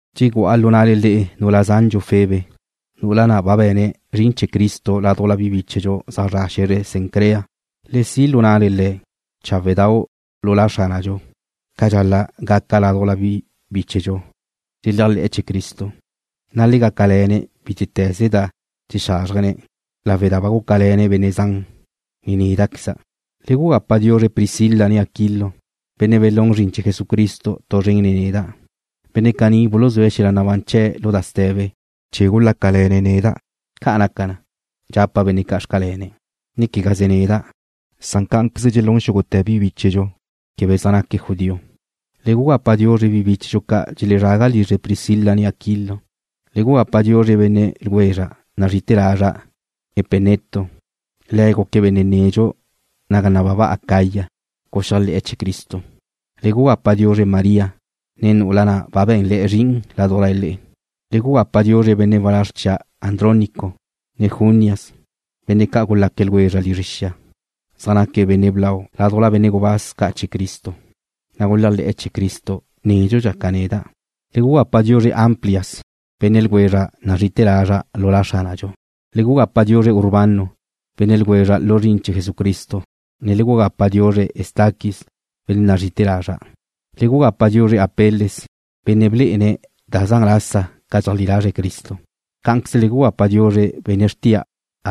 Dxegu'a lu na'le nu'ula zandxu Febe, nu'ula na' ba be̱ne̱' zrin chee̱ Cristo ládujla bi bíchedxu zaj zre̱'e̱ xe̱zre Cencrea. Le si' lu na'le le̱' cháwedau' lu La Xránadxu, ca dxal-la' gaca ládujla bi bíchedxu dxeléajle̱'e̱ chee̱ Cristo, na' le gácale̱ne̱' bítete̱ze da dxexázrjene̱', lawe' da ba gúcale̱ le̱' benne' zan, ne néda'queza'. Le gugapa diuzre Priscila ne Aquilo, benne' belún zrin chee̱ Jesucristo tu zren nen neda'. Benne' caní buluzúe̱' xel-la nabán chee̱' lu da ste̱be chee̱ gúcale̱ne̱' neda'. Ca' naca na, dxapa' benne' ca' xcalenle, ne quegaze neda', san cá'anqueze dxelún xúgute̱ bi bíchedxu quebe zaj naque̱' judío. Le gugapa diuzre bi bíchedxu ca' dxelezrágabe' lizre Priscila, ne Aquilo. Le gugapa diuzre Epeneto, benne' ljwezra' nazri'ite̱ lazra'. Le̱' guque̱' benne' nedxu naga nababa Acaya guxéajle̱'e̱ chee̱ Cristo. Le gugapa diuzre María, nu'ula na' ba be̱nle̱'e̱ zrin ládujla le'e. Le gugapa diuzre benne' walázr chia', Andrónico, ne Junias, benne' ca' gulaque̱' ljwezra' lizre xia. Zaj naque̱' benne' blau ládujla benne' gubáz ca' chee̱ Cristo, na' guléajle̱'e̱ chee̱ Cristo nédxudxa ca neda'. Le gugapa diuzre Amplias, benne' ljwezra' nazri'ite̱ lazra' lu La Xránadxu. Le gugapa diuzre Urbano, benne' ljwezra' lu zrin chee̱ Jesucristo, ne le gugapa diuzre Estaquis, benne' nazri'ite̱ lazra'. Le gugapa diuzre Apeles, benne' blé'ene̱' da zan lasa ca dxeajlí lazre̱' Cristo. Cá'anqueze le gugapa diuzre Aristóbulo, benne' xrtia'.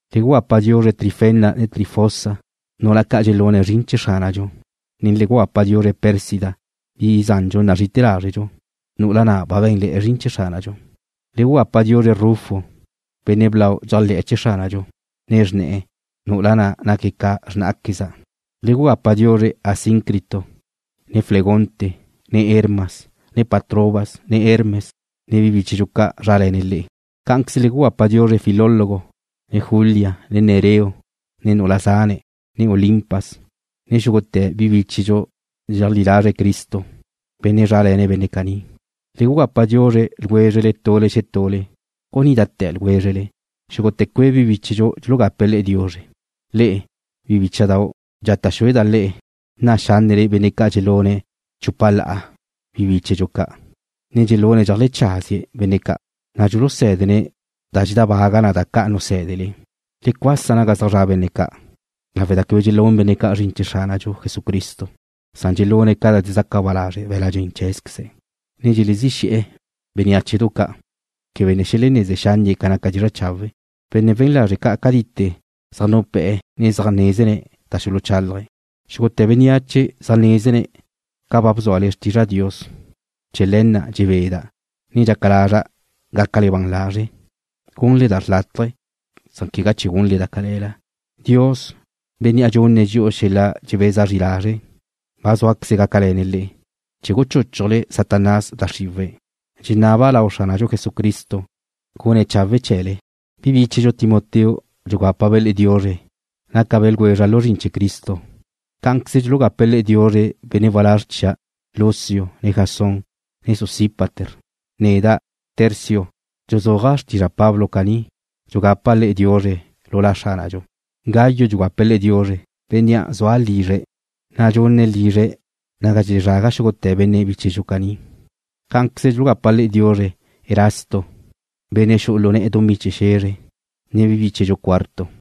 Le gugapa diuzre Trifena ne Trifosa, nu'ula ca' dxelune̱' zrin chee̱ Xránadxu, ne le gugapa diuzre Pérsida, bi zandxu nazri'ite̱ lazrdxu, nu'ula na' ba be̱nle̱'e̱ zrin chee̱ Xránadxu. Le gugapa diuzre Rufo, benne' blau dxéajle̱'e̱ chee̱ Xránadxu, ne xrne̱'e̱, nu'ula na' naque̱' ca xrnáqueza'. Le gugapa diuzre Asíncrito, ne Flegonte, ne Hermas, ne Patrobas, ne Hermes, ne bi bíchedxu ca' zrále̱ne̱' le̱'. Cá'anqueze le gugapa diuzre Filólogo, ne Julia, ne Nereo, ne nu'ula zane̱', ne Olimpas, ne xúgute̱ bi bíchedxu dxeleajlí lazre̱' Cristo, benne' zrále̱ne̱' benne' caní. Le gugapa diuzre ljwézrele tule xetule, gunídate̱ ljwézrele. Xúgute̱ cue' bi bíchedxu dxulugape̱' le'e diuzre. Le'e, bi bícha'dau', dxata' xúeda' le'e, nna' xánnele benne' ca' dxelune̱' chupa la'a bi bíchedxu ca', ne dxelune̱' dxeajlecházie̱' benne' ca', na' dxulusé̱dene̱' da dxedábaga na ca da nusé̱dele. Le cuasa naga zaj zra' benne' ca' lawe' da quebe dxelún benne' ca' zrin chee̱ Xránadxu Jesucristo. Dxelune̱' ca da dxezaca ba lazre' be̱la' dxen chee̱queze̱', ne dxelezí xe̱'e̱ benneáchedu ca' quebe ne xeleneze xánnie̱' ca naca dizra' chawe'. Benne' wen lazre' ca' cadite zaj nupé̱'e̱, ne zaj nézene̱' da dxuluchálaje̱'. Xúgute̱ bénneache zaj nézene̱' ca ba bzúale xtizra' Dios. Chee̱ le̱ na' dxebeda', ne dxaca lazra' gácale ban lazre' gunle da xrlátaje, na' quegá gunle da cale̱la. Dios, Bénnea' dxunne̱' dxi'u xel-la dxebeza zri lazre' ba zúaqueze̱' gácale̱ne̱' le'e, chee̱ guchúchujle Satanás da xriwe̱'. Dxenaba' lau Xránadxu Jesucristo gune̱' gaca chawe' chee̱le. Bi bíchedxu Timoteo dxugápabe' le'e diuzre. Nácabe' ljwezra' lu zrin chee̱ Cristo. Cá'anqueze dxulugape̱' le'e diuzre benne' walázr chia' Lucio, ne Jasón, ne Sosípater. Neda', Tercio, dxuzúaja' xtizra' Pablo caní, dxugapa' le'e diuzre lu La Xránadxu. Gayo dxugape̱' le'e diuzre, bénnea' zua' lizre̱', na' dxunne̱' lizre̱' naga dxelezraga xúgute̱ benne' bíchedxu caní. Cá'anqueze dxulugape̱' le'e diuzre Erasto, benne' xu'u lu ne̱'e̱ dumí chee̱ xe̱zre, ne bi bíchedxu Cuarto.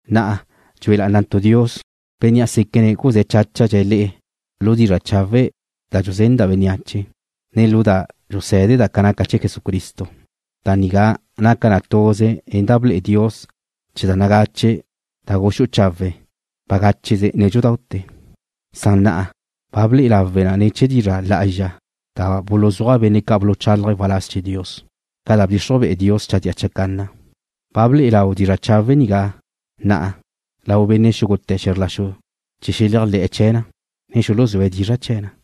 Na'a, dxue lá'anantu' Dios, Bénnea' séquene̱' guzé̱ cháchadxe̱' le'e lu dizra' chawe' da dxuzenda' bénneache, ne lu da dxusé̱deda' ca naca chee̱ Jesucristo. Da nigá naca na tuze nen da ble'e Dios chee̱ da nagache da gulú'u chawe̱' bagácheze nédxudaute̱, san na'a ba ble'e lawe' na ne̱ chee̱ dizra' lá'azxa da buluzúaj benne' ca' buluchálaje̱' waláz chee̱ Dios, ca da bdxixruj be'e Dios chadía chacanna. Ba ble'e lau dizra' chawe' nigá na'a lau benne' xúgute̱ xe̱zr la xu chee̱ xeléajle̱'e̱ chee̱ na, ne xuluzúe̱' dizra' chee̱ na.